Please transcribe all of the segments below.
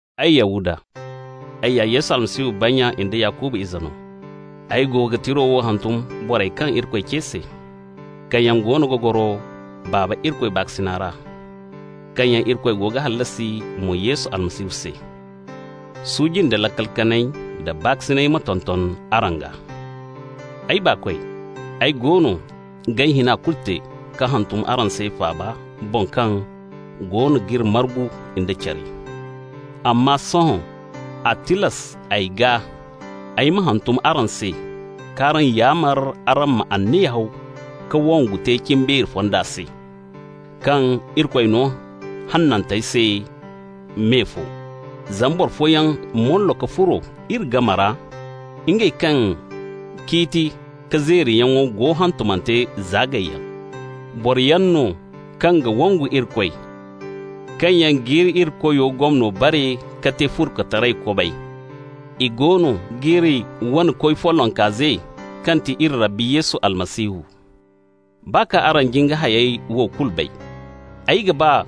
Ay, Yahuda, ay ya Yesu Almasihu bannya nda Yakuba nya ize mo no. Ay go ga tiro wo hantum borey kaŋ Irikoy ce se, kaŋ yaŋ goono ga goro Baaba Irikoy baakasina ra, kaŋ yaŋ Irikoy go ga hallasi mo Yesu Almasihu se. Suuji nda laakal kanay da baakasinay ma tonton araŋ gaa. Ay baakoy, ay goono g'ay hina kulu te ka hantum araŋ se faaba boŋ kaŋ goono g'iri margu nda care, amma sohõ a tilas ay gaa ay ma hantum araŋ se k'araŋ yaamar araŋ ma anniya haw ka wongu te cimbeeri fonda se, kaŋ Irikoy no hanantey se me fo. Zama boro fooyaŋ mollo ka furo iri game ra, ngey kaŋ ciiti ka zeeriyaŋo go hantumante za gayyaŋ. Boroyaŋ no kaŋ ga wangu Irikoy, kaŋ yaŋ g'iri Irikoyo gomno bare mo ka te furkutaray kobay. I goono g'iri wane Koy follonka ze kaŋ ti iri Rabbi Yesu Almasihu. Baa kaŋ araŋ jin ka hayey wo kulu bay, ay ga ba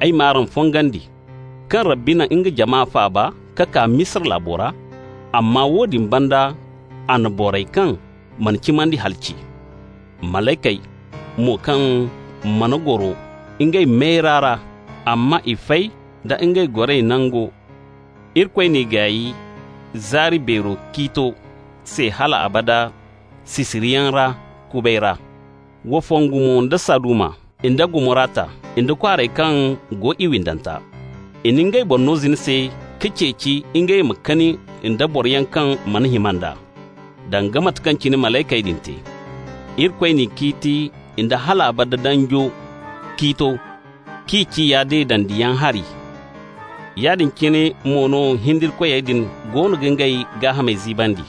ay m'araŋ fongandi, kaŋ Rabbi na nga jama faaba ka kaa Misira laabo ra, amma woodin banda a na borey kaŋ mana cimandi halaci. Malaykey mo kaŋ mana goro ngey boŋ mayra ra, amma i fay da ngey goray nango, Irikoy n'i gaay zaari beero ciito se hal abada sisiriyaŋ ra kubay ra. Wa fongu mo da Saduma nda Gomorata nda kwaarey kaŋ go i windanta. I na ngey boŋ no zina se ka ceeci mo ngey ma kani nda boroyaŋ kaŋ mana hima nd'a, danga mate kaŋ cine malaykey din te. Irikoy n'i ciiti nda hal abada danjo ciito k'i ciya deedandiyaŋ hari. Yaadin cine mo no hindirikoy din goono ga ngey gaahamey ziibandi.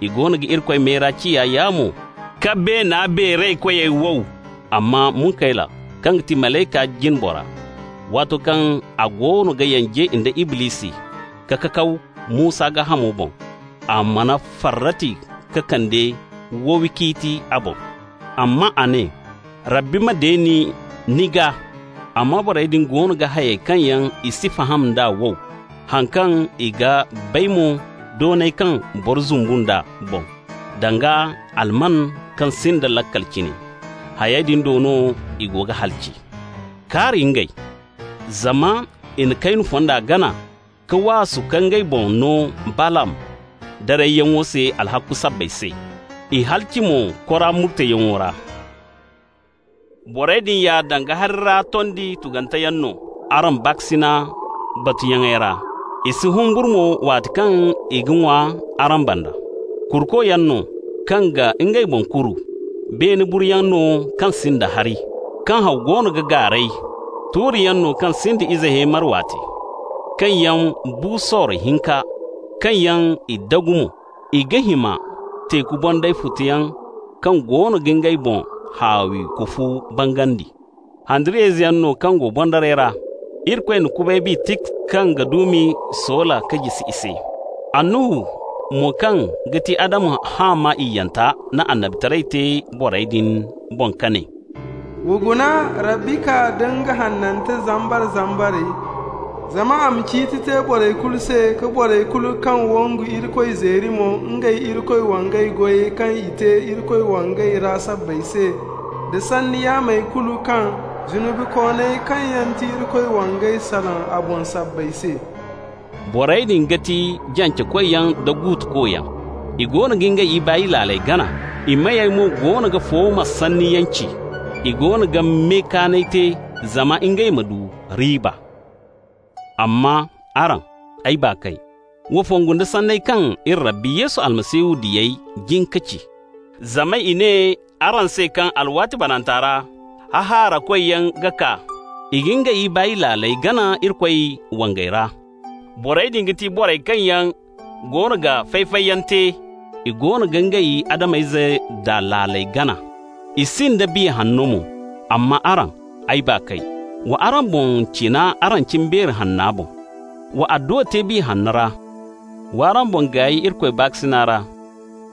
I goono ga Irikoy mayra ciya yaamo ka beena beeraykoyey wow. Amma Munkayla kaŋ ti malaykey jine bora, waato kaŋ a goono ga yanje nda Iblisi ka kakaw Musa gaahamo boŋ, a mana farrati ka kande wowi ciiti a boŋ. Amma a ne: «Rabbi ma deeni ni gaa!» Amma borey din go ga hayey kaŋ yaŋ i si faham d'a wow. Haŋ kaŋ i ga bay mo doonay kaŋ boro zumbu nd'a boŋ, danga almanyaŋ kaŋ sinda laakal cine, hayey din do no i go ga halaci. Kaari ngey! Zama i na Kaynu fonda gana, ka waasu ka ngey boŋ no Balaam darayyaŋo se alhakku sabbay se, i halaci mo Kora murteyaŋo ra. Borey din ya danga hari ra tondi tuganteyaŋ no araŋ baakasinay batuyaŋey ra. I si humburu mo waati kaŋ i ga ŋwa araŋ banda. Kurukoyaŋ no kaŋ ga ngey boŋ kuru, beene buruyaŋ no kaŋ sinda hari, kaŋ haw goono ga gaaray. Tuuriyaŋ no kaŋ sinda ize heemar waate, kaŋ yaŋ bu sorro hinka, kaŋ yaŋ i dagu mo. I ga hima teeku bonday futoyaŋ kaŋ goono ga ngey boŋ haawi kufo bangandi. Handariyayzeyaŋ no kaŋ go boŋdaray ra. Irikoy na kubay bi tik kaŋ ga duumi soola ka jisi i se. Annuhu mo kaŋ ga ti Adamu haama iyyanta na annabitaray te borey din boŋ ka ne: «Wa guna, Rabbi kaa da nga hanante zambar-zambarey, zama a ma ciiti te borey kulu se ka borey kulu kaŋ wangu Irikoy zeeri mo ngey Irikoy wangay goyey kaŋ i te Irikoy wangay ra sabbay se, da sanni yaamey kulu kaŋ zunubikooney kaŋ yaŋ ti Irikoy wangey salaŋ a boŋ sabbay se.» Borey din ga ti jancekoyaŋ da guutukoyaŋ. I goono ga ngey ibaay laaley gana, i meyey mo goono ga fooma sanniyaŋ ci. I goono ga me kaanay te zama ngey ma du riiba. Amma araŋ, ay baakoy, wa fongu nda sanney kaŋ iri Rabbi Yesu Almasihu diyey jin ka ci. Zama i ne araŋ se kaŋ alwaati bananta ra hahaarakoyaŋ ga kaa. I ga ngey ibaay laaley gana Irikoy wangay ra. Borey din ga ti borey kaŋ yaŋ goono ga fay-fayyaŋ te, i goono ga ngey Adam-ize daa laala gana, i sinda Biya Hanno mo. Amma araŋ, ay baakoy, wa araŋ boŋ cina araŋ cimbeeri hanna boŋ. Wa adduwa te Biya Hanno ra. Wa araŋ boŋ gaay Irikoy baakasina ra,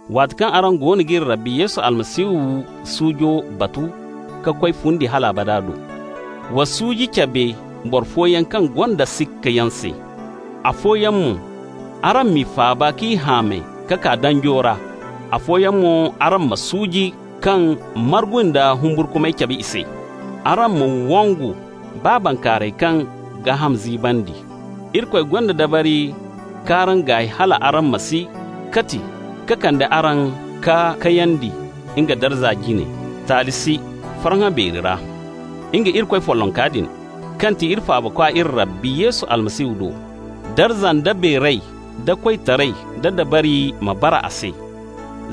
waati kaŋ araŋ goono g'iri Rabbi Yesu Almasihu suujo batu ka koy fundi hal abada do. Wa suuji cabe boro fooyaŋ kaŋ gonda sikkayaŋ se. Afooyaŋ mo, araŋ m'i faaba k'i hamay ka kaa danjo ra. Afooyaŋ mo araŋ ma suuji kaŋ margu nda humburkumay cabe i se, araŋ ma wangu baa bankaaray kaŋ gaaham ziibandi. Irikoy gonda dabari k'araŋ gaay hal araŋ ma si kati, ka kande araŋ ka kayandi nga darza jine, taali si, farhã beeri ra. Nga, Irikoy follonka din, kaŋ ti iri Faabakwa iri Rabbi Yesu Almasihu do, darza nda beeray da koytaray da dabari ma bara a se,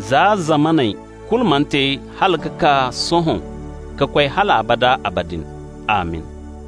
za zamaney kulu mana te hala ka kaa sohõ ka koy hal abada abadin. Amin!